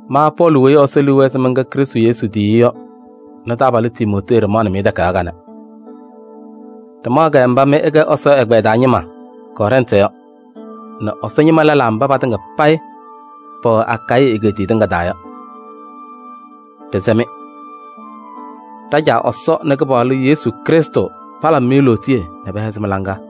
Ma Pɔɔlɩ weyi Ɛsɔ liu wɛɛ se mɛnkɛ Krɩstʋ Yesu tiyiyu yɔ nɛ taabalʋ Timootee ɖɩmaɣnɩ-mɩ takayaɣ kanɛ. Ɖɩmaɣ-kɛ mba mɩ ɩkɛ Ɛsɔ ɛgbɛyɛ taa ñɩma Kɔrɛntɩ yɔ nɛ Ɛsɔ ñɩma lɛlaa mba patɩŋa payɩ pɛwɛ Akayɩ egeetiye tɩŋa taa yɔ. Ɖɩsɛ-mɩ: ɖa-Caa Ɛsɔ nɛ Kɩpaɣlʋ Yesu Krɩstʋ palabɩ-mɩ lootiye nɛ pɛhɛzɩ mɩ-laŋa.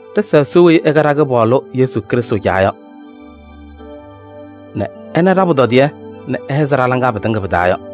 Ɖɩsa Ɛsɔ weyi ɛkɛ ɖa-Kɩpaɣlʋ Yesu Krɩstʋ Caa nɛ ɛnaɣ ɖa-pʋtɔdɩyɛ nɛ ɛhɛzɩɣ ɖa-laŋa pɩtɩŋa pɩ-taa yɔ.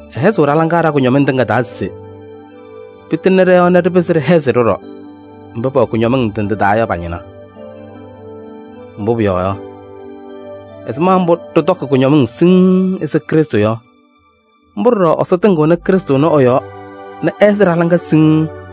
Ɛhɛzɩɣ ɖa-laŋa ɖa-kʋñɔmɩŋ tɩŋa taa se pɩtɩŋnɩ ɖɔ-yɔɔ nɛ ɖɩpɩzɩ ɖɩhɛzɩ ɖɔɖɔ mba pɛwɛ kʋñɔmɩŋ ndɩ ndɩ taa yɔ pa-ñɩna. Mbʋ pʋyɔɔ yɔ, ɛzɩma mbʋ ɖɩtɔkɩ kʋñɔmɩŋ siŋŋ ɛzɩ Krɩstʋ yɔ, mbʋ ɖɔɖɔ Ɛsɔ tɩŋɩɣnɩ Krɩstʋ ɛnʋ ɛ-yɔɔ nɛ ɛhɛzɩɣ ɖa-laŋa siŋŋ.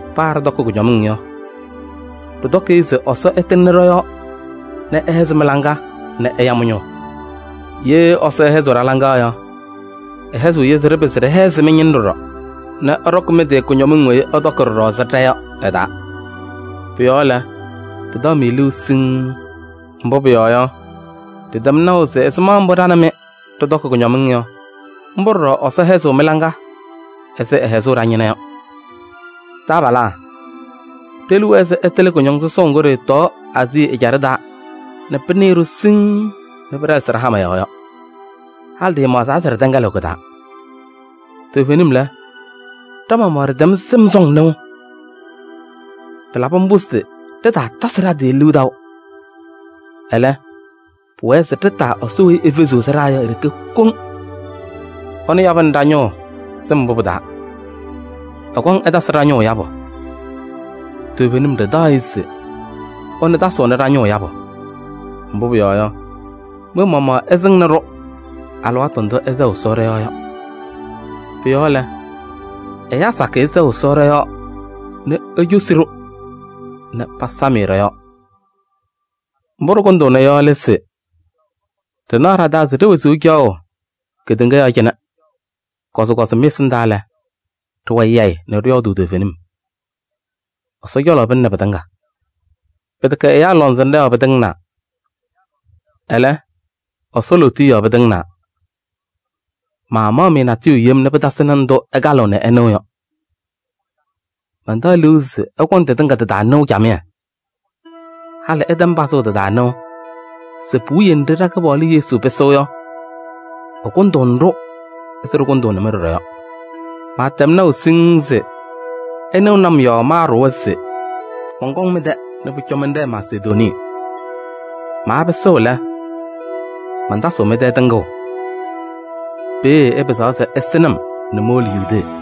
Paa ɖɩtɔkɩ kʋñɔmɩŋ yɔ, ɖɩtɔkɩ-ɩ se Ɛsɔ ɛtɩŋnɩ ɖɔ-yɔɔ nɛ ɛhɛzɩ mɩ-laŋa nɛ ɛya mɩ-ñʋʋ. Ye Ɛsɔ ɛhɛzɩɣ ɖa-laŋa yɔ, ɛhɛzɩɣ-yɛ se ɖɩpɩzɩ ɖɩhɛzɩ mɩ-ñɩna ɖɔɖɔ nɛ ɩɖɔkɩ mɩ-tɩ kʋñɔmɩŋ weyi ɩtɔkɩ ɖɔɖɔ ɛzɩ ɖa yɔ ɩ-taa. Pʋ-yɔɔ lɛ, ɖɩtaɣ-mɩ liu siŋŋ, mbʋ pʋyɔɔ yɔ, ɖɩtɛm naʋ se ɛzɩma mbʋ ɖa nɛ mɩ ɖɩtɔkɩ kʋñɔmɩŋ yɔ, mbʋ ɖɔɖɔ Ɛsɔ hɛzɩɣ mɩ-laŋa ɛzɩ ɛhɛzʋʋ ɖa-ñɩna yɔ. Taabalaa, ɖe-liu wɛɛ se ɩtɩlɩ kʋñɔŋ sɔsɔʋ ŋgʋ ɖɩɩtɔɔ Aazii ɛjaɖɛ taa nɛ pɩnɩɩ-ɖʋ siŋŋ nɛ pɩɖɛlɛsɩ ɖa-hama yɔɔ yɔ. Halɩ ɖɩɩmaɣzaa se ɖɩtɛŋɛlɩɣ kɩ-taa. Toovenim lɛ, ɖa-maɣmaɣ ɖɩtɛm sɩm sɔŋ nɩʋ. Pɩlabɩ mbʋ se ɖɩtaatasɩ ɖa-tɩ taʋ liu. Ɛlɛ, pʋwɛɛ se ɖɩtaa Ɛsɔ weyi efeziɣ sɩɖaa yɔ e-ɖeke kɔŋ. Ɛnʋ yabɩnɩ ɖa-ñʋʋ sɩm mbʋ pɩ-taa. Ɛkɔŋ ɛtasɩ ɖa-ñʋʋ yabʋ. Toovenim ɖɩtaɣ-ɩ se ɛnʋ tasɩɣnɩ ɖa-ñʋʋ yabʋ. Mbʋ pʋyɔɔ yɔ, mɩ-maɣmaɣ ɩsɩŋnɩ-ɖʋ alɩwaatʋ ndʋ ɩsɛɣ Ɛsɔ ɖɔ-yɔɔ yɔ. Pʋ-yɔɔ lɛ, ɛyaa sakɩyɛ sɛɣ Ɛsɔ ɖɔ-yɔɔ nɛ ecosi-ɖʋ nɛ pasam-ɩ ɖɔ-yɔɔ. Mbʋ ɖɩkʋndʋʋna yɔ lɛ se: ɖɩnaɣ ɖa-taa se ɖe-wezuu caɣʋ kedeŋa yɔɔ cɩnɛ, kɔzɩkɔzɩ mɩ-ɛsɩndaa lɛ, ɖɩwɛ yayɩ nɛ ɖɩyɔɔdʋʋ toovenim. Ɛsɔ cɔlɔ pɩlɩnɩ pɩtɩŋa. Pɩtɛkɛ ɛyaa lɔŋsɩnɖɛ yɔɔ pɩtɩŋnaa. Ɛlɛ, Ɛsɔ lootiye yɔɔ pɩtɩŋnaa. Maamaɣ-mɩ natʋyʋ yem nɛ pɩtasɩnɩ ndʋ ɩkalɩɣ nɛ ɩnɩɣ yɔ. Mantaɣ liu se ɩkɔŋ tɩtɩŋa tɩ-taa nɩʋ camɩyɛ. Halɩ ɩtɛm pazʋʋ tɩ-taa nɩʋ se puwiye nɖɩ ɖa-Kɩpaɣlʋ Yesu pɩsɩɣ yɔ, ɩkʋndʋʋnɩ-ɖʋ ɛzɩ ɖɩkʋndʋʋnɩ-mɩ ɖɔɖɔ yɔ. Maatɛm naʋ siŋŋ se ɩnɩɣnɩ-m yɔɔ maaɖʋwa se mɔnkɔŋ mɩ-tɛ nɛ pʋcɔ mɛnɖɛɛ Masedonii. Maapɩsɩɣ lɛ, mantasɩɣ mɩ-tɛ tɩŋʋʋ. Peeye ɩpɩzaɣ se ɩsɩ-m nɛ mowolo Yudee.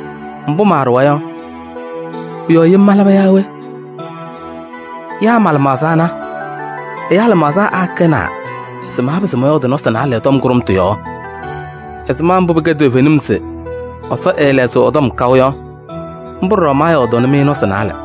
Mbʋ maaɖʋwa yɔ, pʋ-yɔɔ yem malaba yaa we? Yaa ma-lɩmaɣza ana, ɛyaa lɩmaɣza akɛnaa se maapɩzɩ mɔyɔɔdɩ nɔsɩ naalɛ tɔm kʋɖʋmtʋ yɔɔ? Ɛzɩma mbʋ pɩkɛ toovenim se Ɛsɔ ɛɛlɛɣzɩɣ ɛ-tɔm kaʋ yɔ, mbʋ ɖɔɖɔ maayɔɔdʋʋnɩ-mɩ nɔsɩ naalɛ.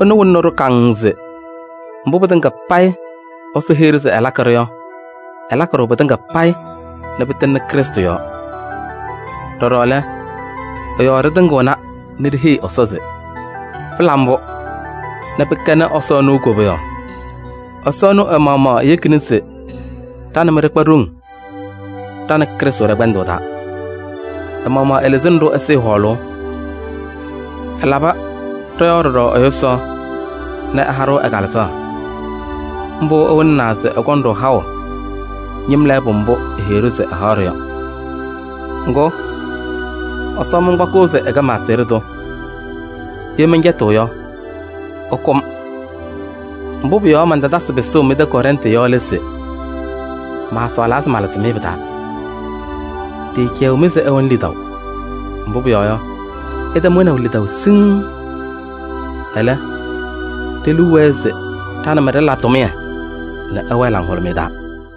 Ɛnʋ wɩlɩɣnɩ-ɖʋ kaŋŋ se mbʋ pɩtɩŋa payɩ Ɛsɔ heyi-ɖʋ se ɛlakɩ-ɖʋ yɔ, ɛlakɩ pɩtɩŋa payɩ nɛ pɩtɩŋnɩ Krɩstʋ yɔɔ. Ɖɔɖɔ lɛ, ɛ-yɔɔ ɖɩtɩŋɩɣna nɛ ɖiheyi Ɛsɔ se: “Pɩla mbʋ!” Nɛ pɩkɛnɩ Ɛsɔ ɛnʋ koboyaɣ. Ɛsɔ ɛnʋ ɛ-maɣmaɣ eyekini se ɖa nɛ mɩ ɖɩkpa ɖoŋ ɖa nɛ Krɩstʋ ɖɛ-kpɛndʋʋ taa. Ɛ-maɣmaɣ ɛlɩzɩnɩ-ɖʋ ɛsɩɩ hɔɔlʋʋ. Ɛlabɩ ɖɔ-yɔɔ ɖɔɖɔ ɛ-yʋsaɣ nɛ ɛha-ɖʋ ɛ-Kalɩzaɣ. Mbʋ wɩlɩɣna se ɛkɔŋ-ɖʋ haʋ ñɩm lɛɛbʋ mbʋ eheyi-ɖʋ se ɛhaɣ-ɖʋ yɔ. Ŋgʋ, Ɛsɔ mankpakɩɣ se ɛkɛ ma-aseɣɖe tʋ, ye mɛncɛtɩɣ yɔ, ɛkʋ-m. Mbʋ pʋ-yɔɔ mantatasɩ pɩsʋʋ mɩ-tɛ Kɔrɛntɩ yɔ lɛ se: maasɔɔlaa se malɩzɩ-mɩ pɩ-taa. Ɖɩɩcɛyɩɣ-mɩ se ɩwɛnɩ lidaʋ. Mbʋ pʋyɔɔ yɔ, ɩtɛm wɛnaʋ lidaʋ siŋŋ. Ɛlɛ, ɖe-liu wɛɛ se ɖa nɛ mɩ ɖɩla tʋmɩyɛ nɛ ɩwɛɛ laŋhʋlʋmɩyɛ taa.